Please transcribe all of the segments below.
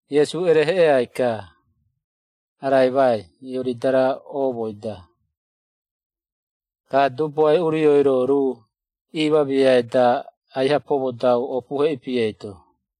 Iesu ereheꞌeai-ka, araimai Ioridara oomoi-da. Ka Dubuae Urioi-ro ruu iimamiai-da, aiha pomodau opuhe ipi eito.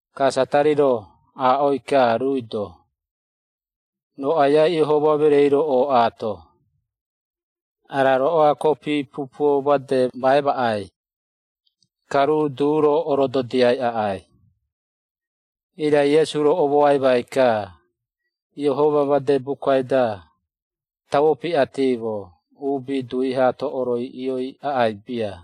Ka Satari-ro aaꞌoi-ka ruui-do, “Roo Aiai Iehoma mereei-ro ooꞌaato? Ara roꞌoa kopi pupuo made ma emaꞌai, ka ruu du-ro orododiai aꞌai.” Irai Iesu-ro omoaimai-ka, “Iehoma made bukai-da, tauo piꞌatimo, ‘Uubi dui haato, oroiꞌioi aꞌai bia.’”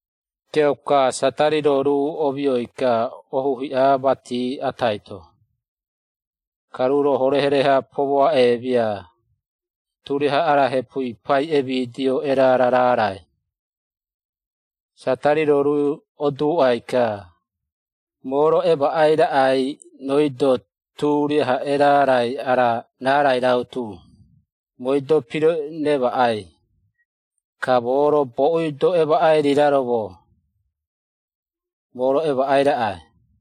Kiauka, Satari-ro ruu omioi-ka, ohu hiꞌa mati atai-to, ka ruu-ro horehore-ha pomoaꞌemia turiaha ara hepui pai emidio erara raarai. Satari-ro ruu oduuꞌai-ka, “Moo-ro emaꞌai raꞌai rooi-do, turiaha erarai ara raarai rautu, mooi-do piremaꞌai ka moo-ro boꞌui-do emaꞌai riraromo, moo-ro emaꞌai raꞌai.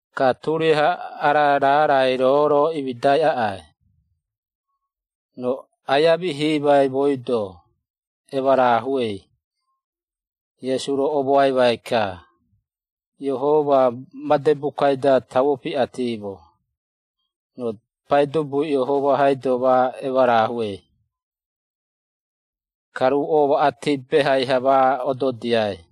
Ka turiaha ara raarai roo-ro imidai aꞌai, roo aia mihimai, mooi-do emarahuei.” Iesu-ro omoaimai-ka, “Iehoma made bukai-da, tauo piꞌatimo, ‘Roo Paidubui Iehoma-haido ma emarahuei, ka ruu omaꞌati behai-ha ma ododiai.’”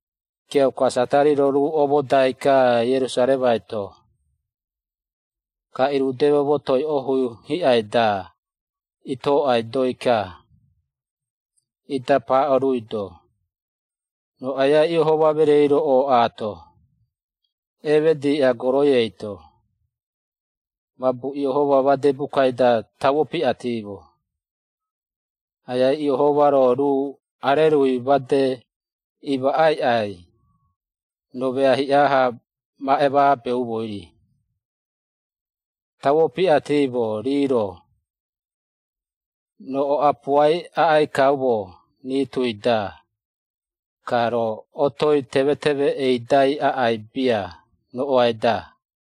Kiauka Satari-ro ruu omodai-ka, Ierusaremai-to, ka irudeme motoi ohu hiꞌai-da itoꞌaidoi-ka, ida paaꞌo ruui-do, “Roo Aiai Iehoma mereei-ro ooꞌaato? Eemediꞌa goroi eito. Mabu, Iehoma made bukai-da, tauo piꞌatimo, ‘Aiai Iehoma-ro ruu arerui made imaꞌaiꞌai, roo mea hiꞌa-ha ma emaabeumoi-ri.’ Tauo piꞌatimo, ‘Rii-ro, roo oꞌapuai aꞌai kaumo, rii tui-da, ka roo otoi temeteme eidai aꞌai bia, roꞌoai-da.’”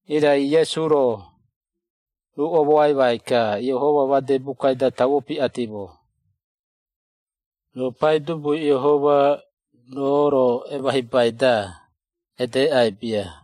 Irai Iesu-ro ruu omoaimai-ka, “Iehoma made bukai-da tauo piꞌatimo, ‘Roo Paidubui Iehoma, roo-ro emahibai-da, edeꞌai bia.’”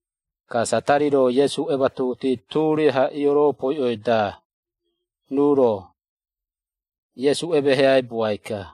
Ka Satari-ro Iesu ematuhuti turiaha ioropoiꞌoi-da, ruu-ro, Iesu emeheaibuai-ka.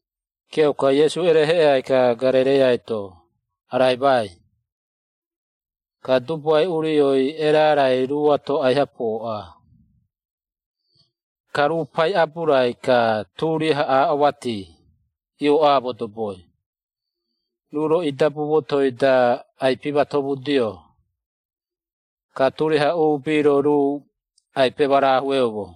Kiauka Iesu ereheꞌeai-ka Garereiai-to araimai, ka Dubuae Urioi erarai ruuato aiha pooꞌa. Ka ruu pai aburai-ka turiaha aaꞌo mati iooꞌa modoboi. Ruu-ro idabu motoi-da ai-pimatomudio, ka turiaha uubi-ro ruu ai-pemarahueumo.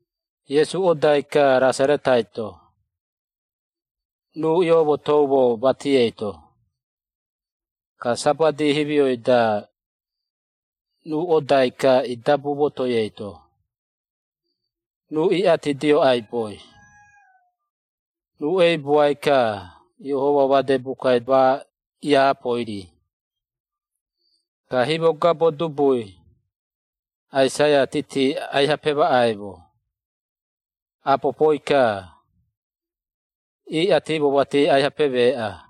Iesu odai-ka Rasaretai-to, ruu ioomotoumo mati eito. Ka Sabati himioi-da, ruu odai-ka idabu motoi eito, ruu iꞌatidio aiboi. Ruu eibuai-ka, Iehoma made bukai ma iaapoi-ri. Ka himogabo dubui, Aisaia titi aiha pemaꞌaimo. Apopoi-ka, iꞌatimo mati aiha pemeeꞌa: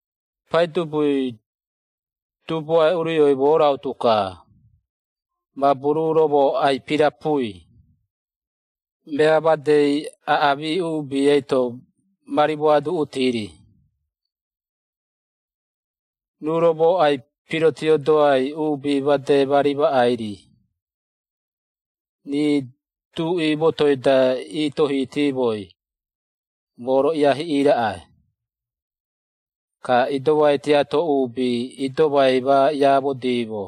“Paidubui Dubuae Urioi moo rautu-ka, mabu ruu-ro moo ai-pirapui, mea madei aꞌamii uubi eito ma rimoaduꞌuti-ri. Ruu-ro moo ai-pirotiodoai, uubi made ma rimaꞌai-ri, rii duꞌi motoi-da iitohitiimoi, moo-ro iiahiꞌii raꞌai, ka idomai tiato uubi idomai ma iaamodiimo,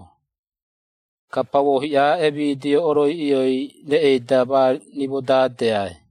ka pauo hiꞌa emidio oroiꞌioi reꞌei-da ma rimodaadeai,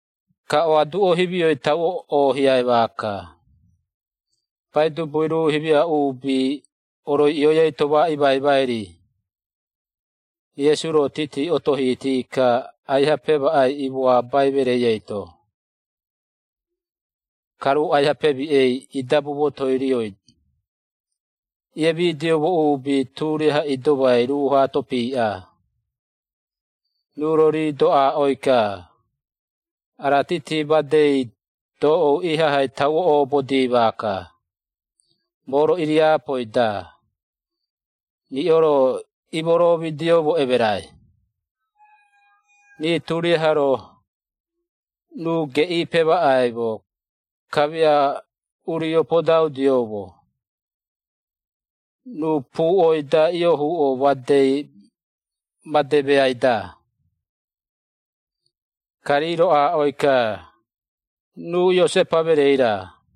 ka oaduꞌo himioi tauo oohiai maaka, Paidubui ruu himia uubi, oroiꞌioi eito ma imaimai-ri.” Iesu-ro titi otohiti-ka, aiha pemaꞌai imoabai mereei eito, ka ruu aiha pemiꞌei. Idabu motoi rioi iemidioumo uubi, turiaha idomai ruu-hato piiꞌaa, ruu-ro rii-do, aaꞌoi-ka, “Ara titi-madei doꞌou ihahai tauo obodii maaka, moo-ro iriapoi-da, riꞌo-ro imoromidioumo emerai.” Rii turiaha-ro, ruu geꞌii pemaꞌaimo, kamia urio podaudioumo, ruu puꞌoi-da iohuꞌo made meai-da. Ka rii-ro aaꞌoi-ka, “Ruu Iosepa mereei-ra?”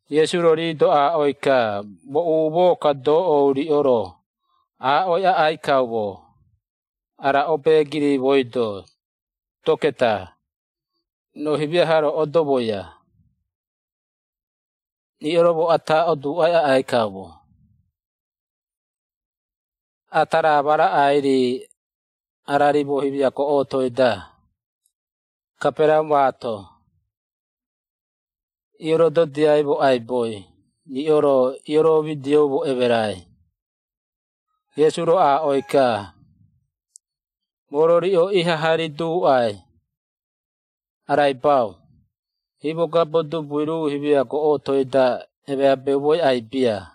Iesu-ro rii-do aaꞌoi-ka, “Moo umoo-ka, doꞌou riꞌo-ro, aaꞌoi aꞌai kaumo, ara obeegiri mooi-do, ‘Doketa, roo himiaha-ro, oodomoia.’ Riꞌo-ro moo ata oduuꞌai aꞌai kaumo, ‘Ata raa ma raꞌai-ri ara rimo himia goꞌotoi-da, Kaperaraumaato iorododiaimo aiboi, riꞌo-ro ioromidioumo emerai.’” Iesu-ro aaꞌoi-ka, “Moo-ro riꞌo ihaha riduuꞌai araibau. Himogabo dubui ruu himia goꞌotoi-da, emabeumoi aꞌai bia.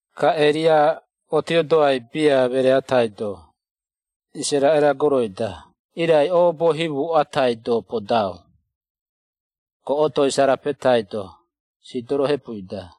Ka Eria otiodoai bia meree atai-do Isaraꞌera goroi-da, irai oobo himu atai-do podau, goꞌotoi Sarapetai-to, Sidoro hepui-da.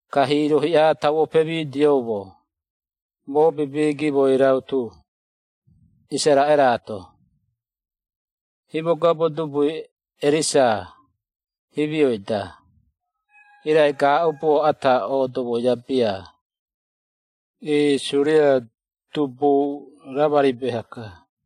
Ka hiiro hiꞌa tauo pemidioumo, mobibi gimoi rautu, Isaraꞌeraato, himogabo dubui Erisa himioi-da, irai gaaꞌubuo ata oodomoia bia, iiꞌi Suria dubui Ramari beha-ka.”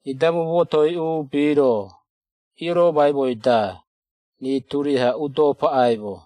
Idabu motoi uubi-ro iioromaimoi-da, rii turiaha udo paꞌaimo.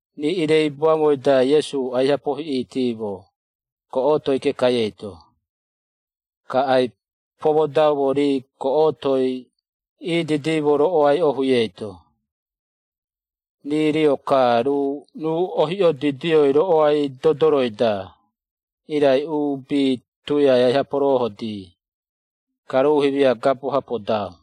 Rii iireibuaumoi-da, Iesu aiha pohiꞌitimo, goꞌotoi kekai eito, ka ai-pomodaumo rii goꞌotoi iididimo roꞌoai ohui eito, rii rio-ka, ruu ohiꞌiodidioi roꞌoai dodoroi-da, irai uubi tuiai aiha poroohodii, ka ruu himia gabo-ha podau.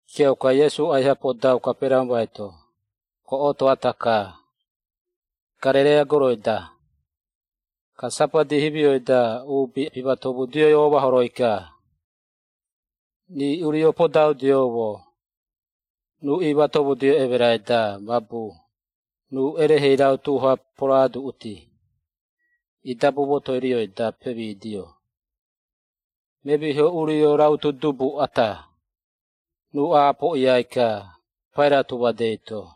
Kiauka, Iesu aiha podau Kaperaraumai-to, goꞌoto ata-ka, Garereia goroi-da, ka Sabati himioi-da, uubi imatomudioi omahoroi-ka. Rii urio podaudioumo, ruu iimatomudio emerai-da, mabu ruu erehei rautu-ha poroaduꞌuti. Idabu motoi rioi-da pemidio, memiho urio rautu dubu ata. Ruu aapoꞌiai-ka, pai rautu madei-to,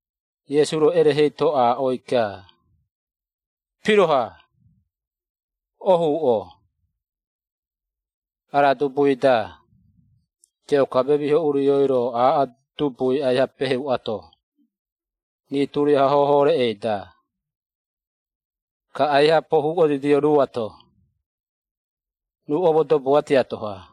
Iesu-ro erehei-to aaꞌoi-ka, “Piroha! Ohuuꞌo ara dubui-da.” Kiauka memiho urioi-ro, aaꞌo dubui aiha peheuꞌato, rii turiaha hoho reꞌei-da, ka aiha pohuꞌodidio ruuato, ruu omodoboa tiato-ha.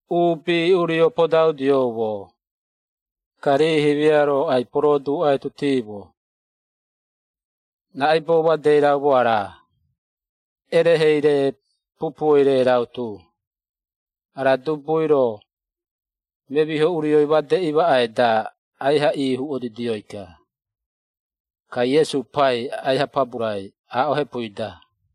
Uubi urio podaudioumo, ka rii himia-ro ai-poroduꞌaitutiimo, “Raꞌaibou made raumo ara? Erehei-re pupuoi-rei rautu, ara dubui-ro, memiho urioi made imaꞌai-da, aiha ihuꞌodidioi-ka.” Ka Iesu pai, aiha paburai, aaꞌo hepui-da.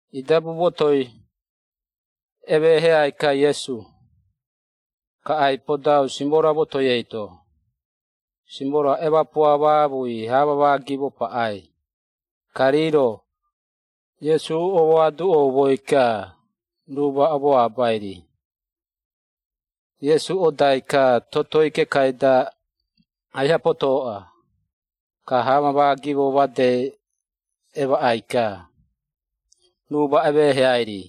Idabu motoi emeheai-ka Iesu, ka ai-podau Simora motoi eito. Simora emapua maamui hamamaa gimo paꞌai, ka rii-ro, Iesu oduuꞌaimoi-ka, ruu ma omoabaimoi-ri. Iesu odai-ka totoi kekai-da aiha potoꞌa, ka hamamaa gimoi made emaꞌai-ka, ruu ma emeheai-ri.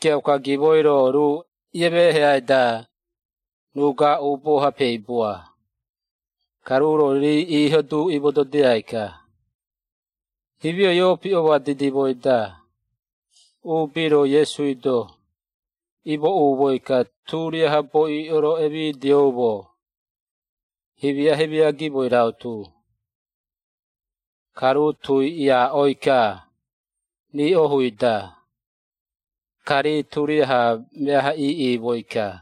Kiauka gimoi-ro, ruu iemeheai-da, ruu gaaꞌubuo-ha peibua, ka ruu-ro, rii iiho du imododia-ka. Himioi ioopiꞌoma didimoi-da, uubi-ro, Iesui-do imooꞌumoi-ka, turiaha boiꞌo-ro emidioumo, himia-himia gimoi rautu, ka ruu tui iiaꞌoi-ka rii ohui-da, ka rii turiaha meaha iiꞌimoi-ka.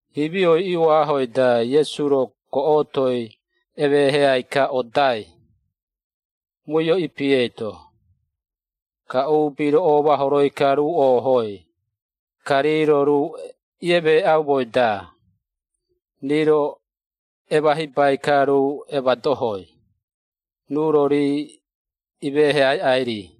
Himioi ioahoi-da, Iesu-ro, goꞌotoi emeheai-ka odai, muio-ipi eito. Ka uubi-ro omahoroi-ka ruu oohoi, ka rii-ro ruu iemeeꞌaumoi-da, rii-ro emahibai-ka ruu emadohoi, ruu-ro rii imeheaiꞌai-ri.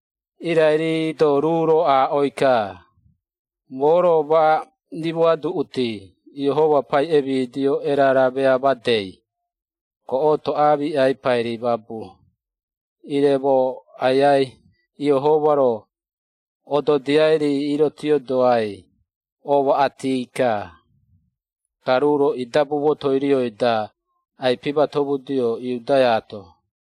Irai rii-do ruu-ro aaꞌoi-ka, “Moo-ro ma rimoaduꞌuti, Iehoma pai emidio erara mea madei, goꞌoto aamiꞌai pairi, mabu ire moo Aiai Iehoma-ro ododiai-ri irotiodoai omoaꞌati-ka.” Ka ruu-ro idabu motoi rioi-da, ai-pimatomudio, Iudeaato.